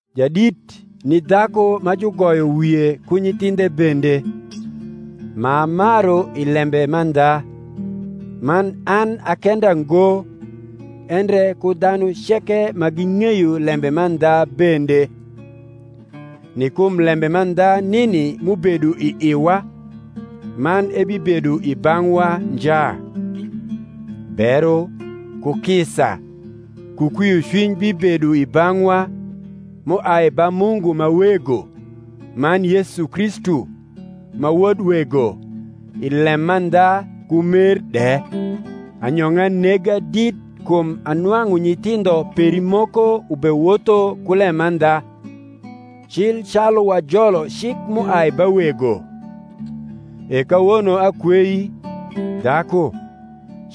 Jadit ni dhaku ma jugoyo wie ku nyithindhe bende, m’amaru i lembe mandha; man an a kenda ngo, endre ku dhanu ceke ma ging’eyo lembe mandha bende; ni kum lembe mandha nini m’ubedo i iwa, man ebibedo i bang’wa nja: Bero, ku kisa, ku kwiocwiny bibedo i bang’wa, m’uai ba Mungu ma Wego, man Yesu Kristu, ma Wod Wego, i lemandha ku mer de. Anyong’a nega dit kum anwang’u nyithindho peri moko ubewotho ku lemandha, cil calu wajolo cik m’uai ba Wego. E kawono akwei, dhaku,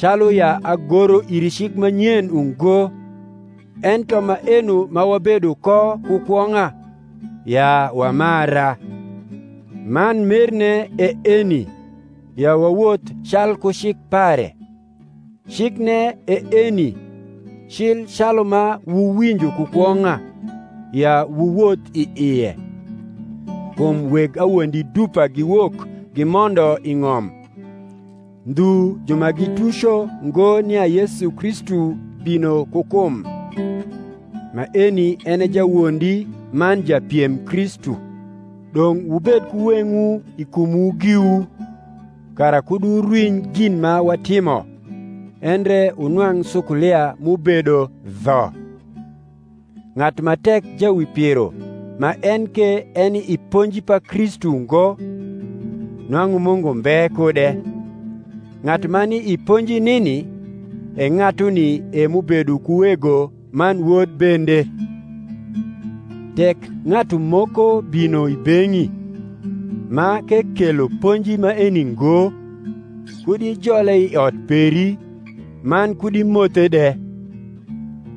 calu ya agoro iri cik ma nyen ungo, ento maeno ma wabedo ko ku kwong’a, ya wamara. Man merne e eni, ya wawoth calku cik pare. Cikne e eni, cil calu ma wuwinjo ku kwong’a, ya wuwoth i ie. Kum weg awondi dupa giwok gimondo i ng’om, ndhu ju ma gituco ngo nia Yesu Kristu bino ku kum. Maeni en e jawondi man japiem Kristu. Dong’ wubed ku weng’wu i kumwu giwu, kara kud wurwiny gin ma watimo, endre wunwang’ sukulia m’ubedo dho. Ng’atu ma tek jawipiro ma en ke eni i ponji pa Kristu ngo, nwang’u Mungu mbe kude: ng’atu ma ni i ponji nini, e ng’atuni e m’ubedo ku Wego man Wod bende. Tek ng’atu moko bino i beng’i, ma k’ekelo ponji maeni ngo, kud ijole i ot peri, man kud imothe de: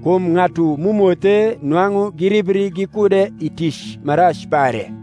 kum ng’atu m’umothe nwang’u giribri gikude i tic ma rac pare.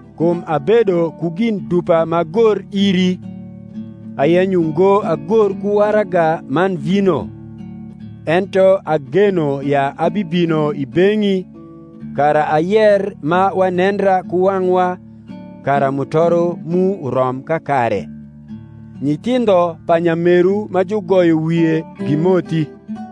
Kum abedo ku gin dupa m’agor iri, ayenyo ngo agor ku waraga man vino: ento ageno ya abibino i beng’i, kara ayer ma wanendra ku wang’wa, kara mutoro mu urom kakare. Nyithindho pa nyameru ma jugoyo wie gimothi.